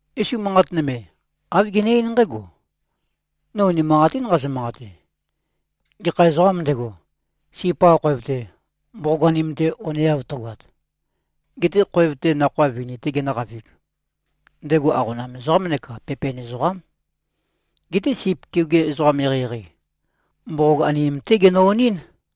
Yesu manqat nøme, āv gene-eín nqǽgo, “No unimanqatín nqazø-manqate. Gekha ezoqām ndego, sip-qa khoev-te, mboqog-anim-te oneav tøgoat, getē khoev-te nakhoa vini-tē genø̄qavīg, ndego aqona ezoqám neka pepen ezoqám. Geté sip keoge ezoqam eqeieqei, mboqog-anim-té genø-onɨ́n.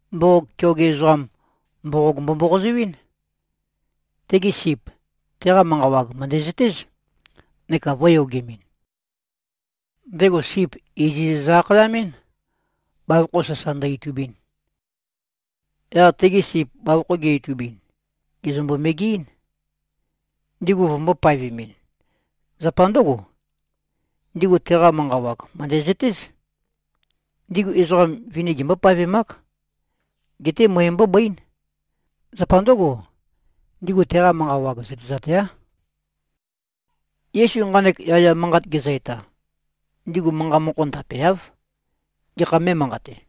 Mboqog keoge ezoqam, mboqog mbo-mboqozoɨ́n. Tegi sip, teqa manqa wag mø̀ndæzøtéz, neka vø̄yogemɨn. Ndego sip iziz zø-akhayamɨ́n, bavokho sasa ndø-itubin. Yaq tegi sip bavokho ge-itubin, gèzømbo-megeɨ́n, ndigu vømbō-paevemɨn. Zapa ndǿgo, ndigu teqa manqa wag, mø̀ndæzøtéz. Ndigu ezoqa vini gembó-paevemák. Geté møe mbóbøín. Zapa ndǿgo, ndigu teqa manqa wag zøtezateáv.” Yesu nqanek yaya manqat gezø-eta, ndigu manqa mokho ndapeáv, gekha mé꞉manqate.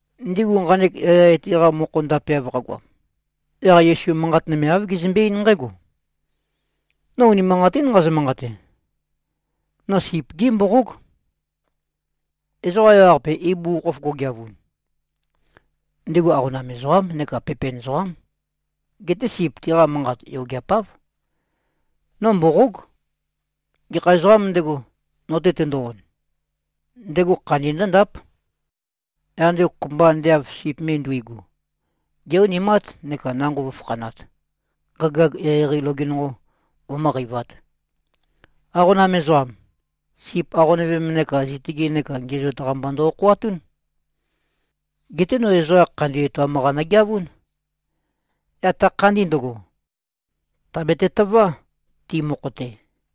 Ndigu nqanek yaya etæ-qa mokho ndapeav qagoam, yaq Yesu manqat nøme āv gezømbe-eín nqǽgo, “No unimanqatín nqazø-manqate. No sip-gí mboqóg. Ezoqa ewaqape ibugukhokhof go꞉geavun, ndigu aqona ezoqám neka pepen ezoqám. Geté sip tiqa manqat yogeapáv. No mboqóg. Gekha ezoqām ndego, no-te tendo-on, ndego khandi ndǿndáp. Yaq ndego, kopømba ande av sip me nduigu, gé-onimát neka nango vǿfakhanāt, gagayag eqeieqei loge nonqo vømǿqeivāt. Aqona ezoqam, sip aqonøvem neka zitøge neka ngiæzoat-qa mba ndo-okhoatún. Geté no ezoqa khandi etoam-qa nogeavún. Yaq ta khandi ndøgo, tàbete-tøvá, ti mokho-te.”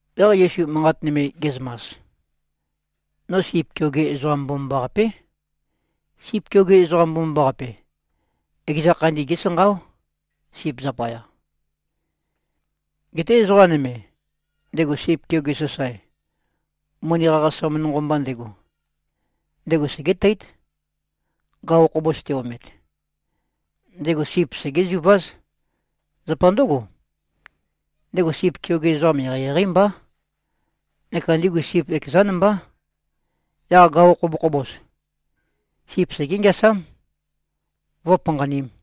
Yaq Yesu manqat nøme ge꞉zømas, “No sip keoge ezoqam mbomambaqapé. Sip keoge ezoqam mbomambaqape, ekeza khandi gésanqáo, sip zapaya. Geté ezoqa nøme, ndego sip keoge sasae, moni qaqasam nonqo mba ndego, ndego segéteít, gaqo khobos te-omet. Ndego sip segézuváz. Zapa ndǿgo, ndego sip keoge ezoqam eqeieqeí mbá neka ndigu sip ekezán mbá. Yaq gaqo khobokhobos, sip segé-ngeasám, vǿpanqanīm.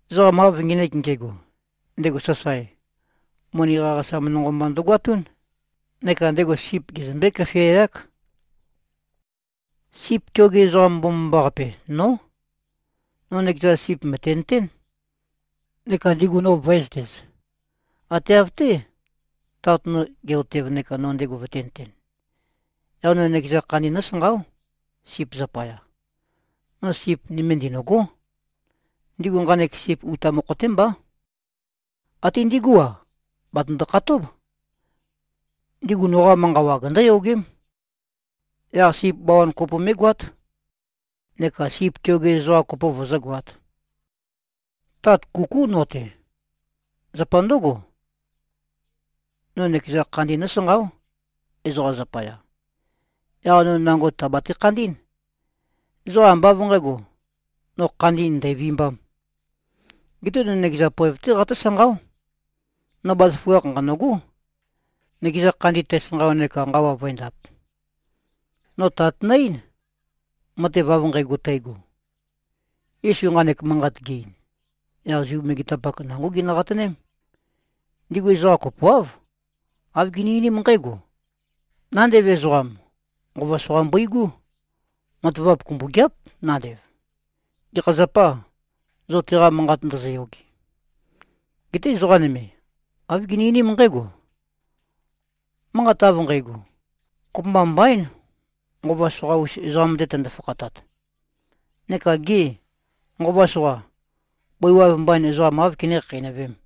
Ezoqam av ngenek nge꞉go, ndego sasae, moni qaqasam nonqo mba ndøgoatún, neka ndego sip gezømbé-køfiayák. Sip keoge ezoqam mbomambaqape, nó. No nøkeza sip mø̀tenøtén, neka ndigu no vø̄ezøtez, ate av-té, Tat no ge꞉-otev neka no ndego vøtēnøten. Yaq no nøkeza khandi nósanqáo, sip zapaya. No sip nøme ndinø̂gó. Ndigu nqanek sip uta mokho-té mbá. Até ndigú-a, batøndo-khatób. Ndigu noqa manqa wag ndǿyogém. Yaq sip bawan kopo mé꞉goát, neka sip keoge ezoqa kopo vøzǿgoāt. Tat kukú no-te. Zapa ndǿgo, no nøkeza khandi nósanqáo, ezoqa zapaya. Yaq no nango tàbate-khandí꞉n. Ezoqa ambá av nqǣgo, no khandi ndæ̀vimbām. Geté no nøkeza poev-té qatǿsanqáo. No bazaføgakh nqanø̂gó, nøkeza khandi tæsanqao neka nqawa vǿendāp. No Tat nø-eín, matev av nqægo tægo.” Yesu nqanek manqat ge-ein, yaq Zu megetapak nangó ginø-qatøném. Ndigu ezoqa kopoáv, āv gini-einím nqǽgo, “Nandev ezoqam, nqova soqa mbøigú! Matavap kumbøgeáp, nandev. Gekha zapâ, zo teqa manqat ndozoyoge?” Geté ezoqa nøme, āv gini-einím nqǽgo, “Manqat av nqægo, kopømba mbaín, nqova soqa-us ezoqam-te tøndo-fakhatat. Neka gê, nqova soqa, bøi waev mbain ezoqam áv kené-khakheinøvēm?”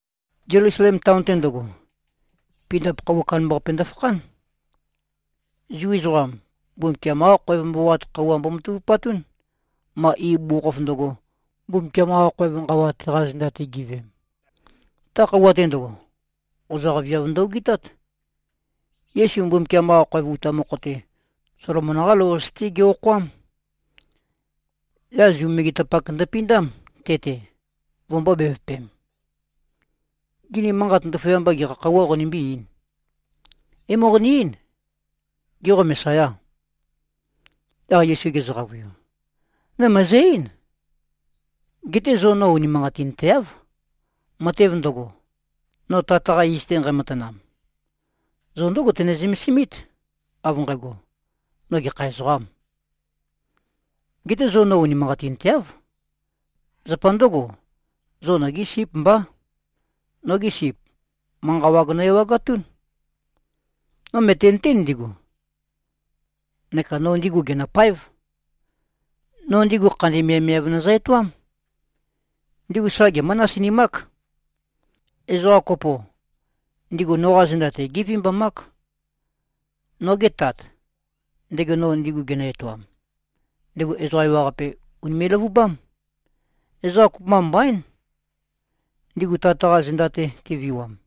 Zelusalem taon-te ndøgo, pindap khøuwa kandambaqape ndøfakhán. Zu ezoqam, Mbumbukiam-qá khoev mboqoat khøuwa mbomatavupatún, ma ibugukhokhof ndøgo, Mbumbukiam-qa khoev nqawa teqa zenda-te giveem. Ta khøuwa-te ndøgo, qozaq viav ndø-ogitát. Yesu Mbumbukiam-qa khoev uta mokho-te, Solomon-qá lou-qase-té ge-okhoám. Yaq Zu megetapak ndøpindám, te-te, vømbō-bevøpem, “Gê, ni manqat ndaføyamba gekha khøuwā qonimbí-eīn? É-moqoni-eín: Gê, qo Mesayâ?” Yaq Yesu gezø-qavøiu, “No mø̀ezø-eín. Geté zo no unimanqatinteáv. Matev ndøgo, no Tat-qa iz-te nqæmatanam, zo ndǿgo tøne-zømesimít, av nqægo, no gekha ezoqām. Geté zo no unimanqatinteáv. Zapa ndǿgo, zo nogí síp mbá. Nogi sip, manqa wag nø-ewagatún. No mø̀tenøtén ndigu, neka no ndigu gènøpáev. No ndigu khandi miavmiav nøzø-etoám. Ndigu sa gemǿ-nasinimák. Ezoqa kopo, ndigu noqa zenda-te gévimbamák. Noge Tat, ndego no ndigu genø-etoam, ndego ezoqa ewaqape ùnime꞉-løvubám. Ezoqa kopømba mbaín, ndigu Tat-qa zenda-te te꞉viwam.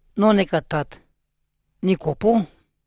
No neka Tat, ni kopó.”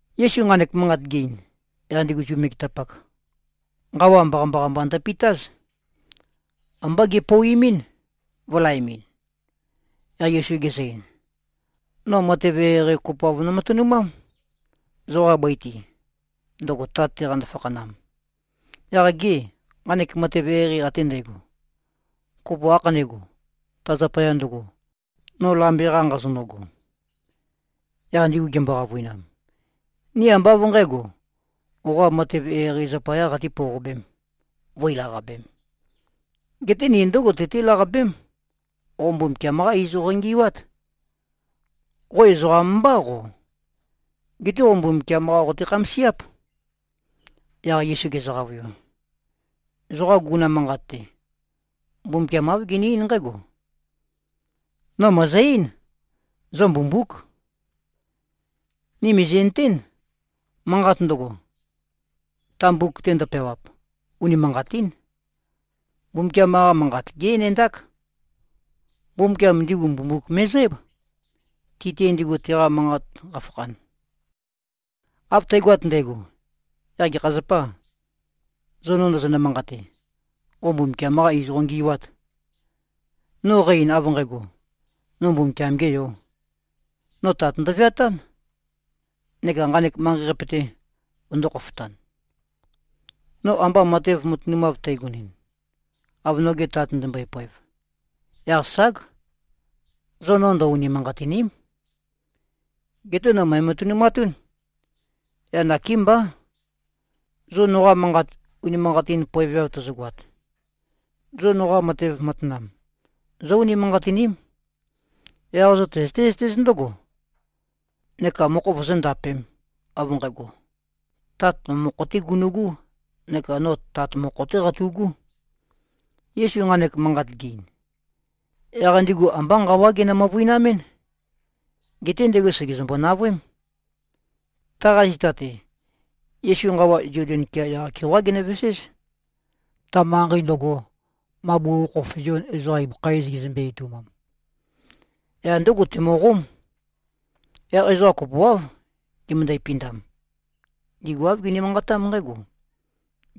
Yesu nqanek manqat ge-ein, yaq ndigu Zu megetapak, nqawa mbaqambaqa mba ndøpitáz. Ambá gepouimín, vø̄laemɨn. Yaq Yesu gezø-ein, “No matev eqeieqei kopoav nomatønumám, zoqa bøi-te, ndøgo Tat-te qando-fakhanam. Yaq gê, nqanek matev eqeieqei ate ndægo, kopo ākhanégo, ta zapaya ndøgo, no lambe-qa nqazonøgo?” Yaq ndigu gimbo-qavøinam, “Ni ambá av nqǣgo, qoqa matev eqeieqei zapayā qatī-pouqobēm, vǿi-laqabēm. Geté ni ndǿgo tøtí-laqabém. Qo Mbumbukiam-qá iz qongi꞉wát. Qo ezoqam mbá, qo. Geté qo Mbumbukiam-qá qote-khamasiáp.” Yaq Yesu gezø-qavøiu, “Zoqa guguna manqat-te, Mbumbukiam āv gene-eín nqǽgo, ‘No mø̀ezø-eín: Zo mbumbúk.’ Ni mìzi꞉nøtén, manqat ndøgo, ta mbuk-te ndøpeawap, unimanqatín. Mbumbukiam-qa Manqat gé-enendák. Mbumbukiam ndigu mbumbuk me꞉zǽb, ti-te ndigu teqa manqat qafakhan. Av tægoat ndægo, yaq gekha zapâ, zo no ndozonø-manqate, ‘qo Mbumbukiam-qā iz qongi꞉wāt’, no qæ-ein, av nqægo, no Mbumbukiam-gē Yō. No Tat ndøveatán neka nqanek manqei-qape-te vøndō-khofotan. No amba matev matønumav tægonɨn, av noge Tat ndømbøe-poev, yaq ság, zo no ndø-unimanqatìni᷄m. Geté no mø̀ematønumatún. Yaq nakémbá. Zo noqa manqat unimanqatin poeveav tozogoat, zo noqa matev matanam zó-unimanqatiním. Yaq zo tøzøté-zøtéz ndǿgo, neka mokho vozóndapēm, av nqægo, Tat no mokho-té gunu꞉gú neka no Tat mokho-té qatu꞉gú.” Yesu nqanek manqat ge-ein, yaq ndigu ambá nqawá ginø-møvøinamɨ́n. Geté ndego sègezømbo-navøém. Taqa zita-te, Yesu nqawa Zoden kea yaq-keoqá genøveséz, ta manqei ndøgo, ma bugukhokhof Zion ezoqa ibøkha iz gezømbe-etoumam. Yaq ndǿgo temøqóm. Yaq ezoqa kopoáv gimøndæ-pindam. Ndigu āv gini-manqatám nqǽgo,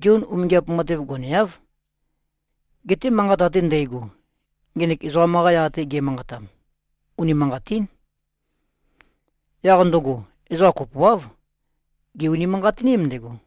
“Zion umingiap matev goneáv. Geté manqat ate ndægo, ngenek ezoqam-qa yaq-te ge꞉manqatam, unimanqatín.” Yaq ndøgo, ezoqa kopoáv, gè-unimanqatiním ndego.